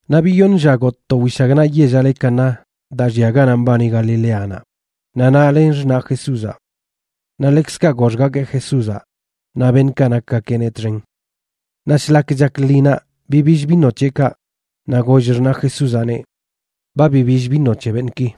Naꞌ biyoṉ lla gotꞌ to wishagnaꞌ yellaꞌ le Caná daa llia ganaꞌ mbani Galileanaꞌ, naꞌ naꞌ len xṉaꞌ Jesúzaꞌ. Naꞌ ḻekzkaꞌ goxgakeꞌ Jesúzaꞌ naꞌ beṉꞌkaꞌ nakgakeꞌneꞌ txen. Naꞌ shlak chak lṉinaꞌ bibill vino c̱heꞌkaꞌ, naꞌ goll xṉaꞌ Jesúzaꞌneꞌ: ―Ba bibill vino c̱he beṉꞌki.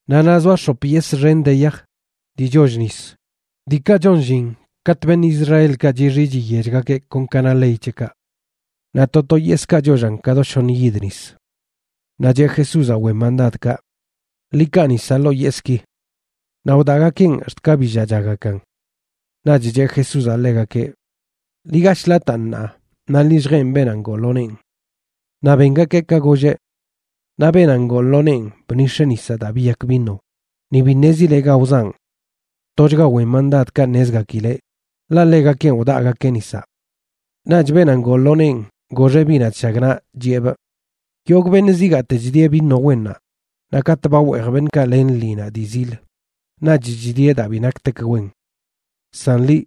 Naꞌ naꞌ zoa x̱op yesꞌ xen de yaj, dii choll nis, diikaꞌ chon llin katꞌ beṉꞌ Israelkaꞌ chixi chiyechgakeꞌ kon ka na ley c̱heꞌkaꞌ. Naꞌ to to yesꞌkaꞌ chollan ka do shoṉ yid nis. Naꞌ cheꞌ Jesúzaꞌ wen mandadkaꞌ: ―Ḻi kaa nisaꞌ ḻoo yesꞌki. Naꞌ wdaꞌgakeꞌn ax̱t ka billaꞌchagakan. Naꞌch cheꞌ Jesúzaꞌ ḻegakeꞌ: ―Ḻi gashꞌ lataan ṉaa naꞌ ḻi lljeen beenaꞌ ngoo lo neen. Naꞌ bengakeꞌ ka golleꞌ. Naꞌ beenaꞌ ngoo lo neen bnix̱eꞌ nisaꞌ daa biyak vino, ni bi ṉezileꞌ ga wzaꞌn. Tochga wen mandadkaꞌ ṉezgakileꞌ, ḻaꞌ ḻegakenꞌ wdaagakeꞌ nisaꞌ. Naꞌch beenaꞌ ngoo lo neen goxeꞌ biꞌnaꞌ chshagnaꞌ, chiꞌebꞌ: ―Yogꞌ beṉꞌ zigaate chdieꞌ vino wennaꞌ, naꞌ katꞌ ba weej beṉꞌkaꞌ len lṉinaꞌ dii zil, naꞌch chdieꞌ daa bi naktek wen. San liꞌ,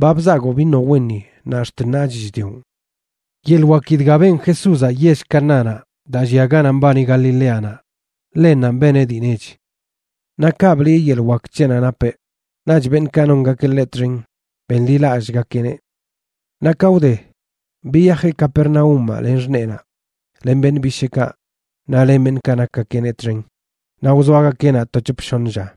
ba bzagoo vino wenni naꞌ ax̱t ṉaach chdioꞌn. Yeḻꞌ waki dga ben Jesúzaꞌ yell Canánaꞌ daa llia ganaꞌ mbani Galileanaꞌ, ḻennanꞌ beneꞌ dii nech. Naꞌ kaꞌ bliꞌe yeḻꞌ wak c̱heꞌnaꞌ napeꞌ, naꞌch beṉꞌkaꞌ nongakeꞌ ḻeꞌ txen benḻilallꞌgakeꞌneꞌ. Naꞌ ka wde, biyajeꞌ Capernaúmaꞌ len xṉeenaꞌ, len beṉꞌ bisheekaꞌ naꞌ len beṉꞌkaꞌ nakgakeꞌneꞌ txen, naꞌ wzoagakeꞌ naꞌ to c̱hop shoṉ lla.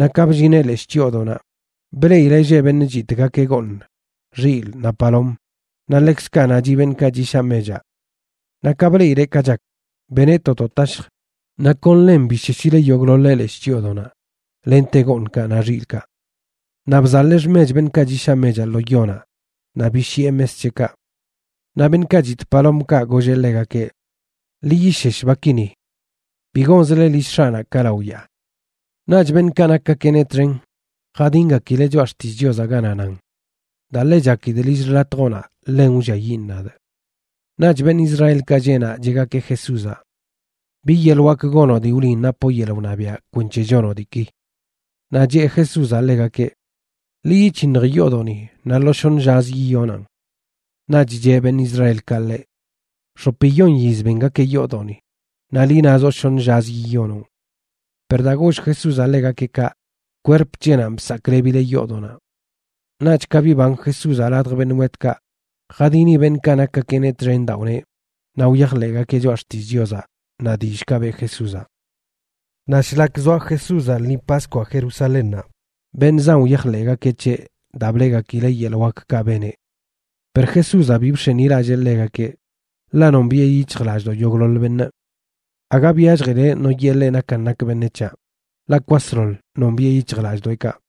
Naꞌ ka bllineꞌ leshꞌ chyoodoꞌnaꞌ, bleꞌileꞌ lleꞌ beṉꞌ chitꞌgakeꞌ gooṉ, xilꞌ, naꞌ palom, naꞌ ḻekzkaꞌ naꞌ chiꞌ beṉꞌkaꞌ chishaꞌ mechaꞌ. Naꞌ ka bleꞌileꞌ ka chak, beneꞌ to do tashj, naꞌ kon ḻen bisheshileꞌ yogꞌḻoḻeꞌ leshꞌ chyoodoꞌnaꞌ lente gooṉkaꞌ naꞌ xilꞌkaꞌ. Naꞌ bzaḻee xmech beṉꞌkaꞌ chishaꞌ mechaꞌ lo yonaꞌ naꞌ bishiꞌe mes c̱heꞌkaꞌ. Naꞌ beṉꞌkaꞌ chitꞌ palomkaꞌ, golleꞌ ḻegakeꞌ: ―¡Ḻi yishesh baki ni! ¡Bi gonzle lill X̱aꞌnaꞌ ka lao yaa! Naꞌch beṉꞌkaꞌ nakgakeꞌneꞌ txen jadingakileꞌ Choꞌa Xtillꞌ Chiozaꞌ ganaꞌ nan: “Daa ḻe chakidꞌ lill xḻatjoꞌnaꞌ ḻen wlliayiꞌn nadꞌ.” Naꞌch beṉꞌ Israelkaꞌ lleꞌ naꞌ cheꞌgakeꞌ Jesúzaꞌ: ―¿Bi yeḻꞌ wak gonoꞌ dii wliꞌn napoꞌ yeḻꞌ wṉabiaꞌ kwenc̱he chonoꞌ diiki? Naꞌ cheꞌ Jesúzaꞌ ḻegakeꞌ: ―Ḻi yic̱hinj yoodoꞌni naꞌ lo shoṉə llazə yiyonaꞌn. Naꞌch cheꞌ beṉꞌ Israelkaꞌ ḻeꞌ: ―X̱opiyon yiz bengakeꞌ yoodoꞌni, naꞌ liꞌ nazoꞌ shoṉə llazə yiyonoꞌn. Per daa goll Jesúzaꞌ ḻegakeꞌ kaꞌ, kwerp c̱heꞌnanꞌ bsaklebileꞌ yoodoꞌnaꞌ. Naꞌch ka biban Jesúzaꞌ ladj beṉꞌ wetkaꞌ, jadini beṉꞌkaꞌ nakgakeꞌneꞌ txen daa wneꞌ, naꞌ wyajḻeꞌgakeꞌ Choꞌa Xtillꞌ Chiozaꞌ naꞌ dillꞌkaꞌ beꞌ Jesúzaꞌ. Naꞌ shlak zoa Jesúzaꞌ lṉi Paskwaꞌ Jerusalénnaꞌ, beṉꞌ zan wyajḻeꞌgakeꞌ c̱heꞌ daa bleꞌgakileꞌ yeḻꞌ wakkaꞌ beneꞌ. Per Jesúzaꞌ bi bx̱enilallee ḻegakeꞌ, ḻaꞌ nombiꞌe yic̱hjlallꞌdoꞌ yogꞌḻoḻ beṉꞌ. Aga byalljileꞌ no yee ḻeꞌ nakan nak beṉec̱haꞌ, ḻaꞌ kwasḻoḻ nombiꞌe yic̱hjlallꞌdoꞌekaꞌ.